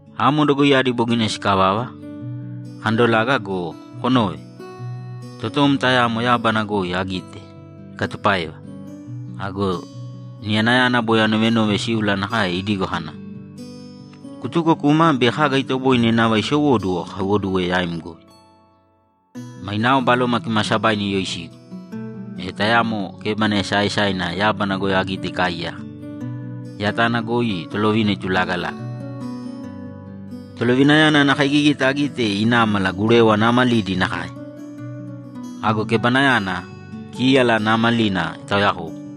Amo dogoiyadi bogina sikavava, akandolaga go, konōve! Totom tayamo yábana goi agite ikatupáeva! Ago niyanayana boi anovenove síula nakae idigo kana, ‘Kutūko kūma bei kaga itoboine nava isowóduwo akaiwoduwe yaim goi.’ Mainao Baloma Kimaasabaina iyoisigu, e tayamo kébana esaaesaina yábana goi agite ikaaiyaka, yatana goi Tolovina itulaagalaga. Tolovinayana ana kaigigita agite inámala gurewa naamalidi nakae. Ago kebanayana, kíyala naamalina itaoyakobu.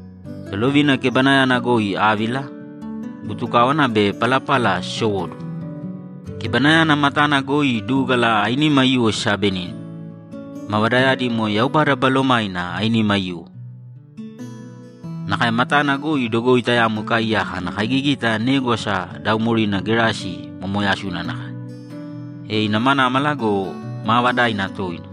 Tolovina kebanayana goi ávila, butukáwana be palapala sisowóduwo. Kebanayana matana goi dúgala ainima aiyuwo sisaabenínima, mavadayadi moe Yaubada Balomainao ainima aiyuwo. Nakae matana goi dogoi tayamo ikaaiyaka ana kaigigita négwasa daaumorina gerasi momooyasuna nakae, e inamanámala go, maavadaina toina.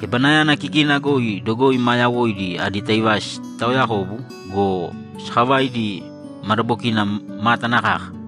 Kebanayana kikina goi dogoi maa yawoidi adi taivasi sitaaoyakobu go, sakavaidi madabokina mátana kaka.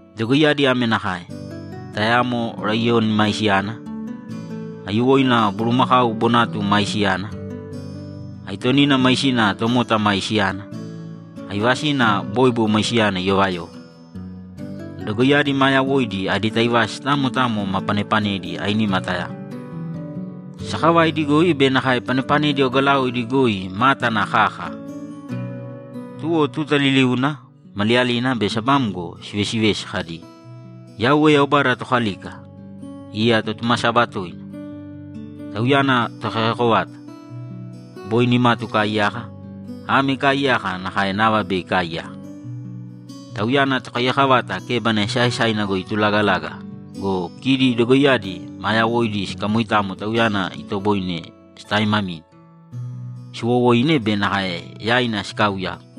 Dogoiyadi ame nakae: Tayamo laiyoni maisiyana, aiyuwoina bulumakau bonatuna maisiyana, aitonina maisina tomota maisiyana, aivasina bóibo maisiyana iyovayova. Dogoiyadi maa yawoidi adi taivasi tamo tamo ma panepanedi ainima tayamo. Sakavaidi goi be nakae panepanedi ogalaoidi goi mátana kaka. Tuwo tuta liliuna, maliyalina be sabamgo, sivesivesi kadi, ‘Yauwe Yaubada Tokalika, iya Totumasaba toina. Tauyana Tokaiyako vata: Boi nimatu ikaaiyaka, ame ikaaiyaka nakae nava bei ikaaiyaka.’ Tauyana Tokaiyako vata kebana esaaesaina goi itulaagalaga go, kidi dogoiyadi maa yawoidi sikamoitamo Tauyana itoboine sitaaimamine, siiwowoine be nakae yaina sikaauyagu.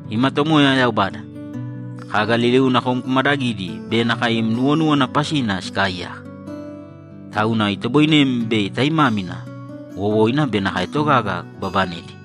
‘Ima Tomoya Yaubada, Kaga liliuna kom kumadagidi be nakae im nuwonúwana pasina sikaaiyaka. Tauna itoboinem bei taimámina, wowoina be nakae togaga kubabanedi.’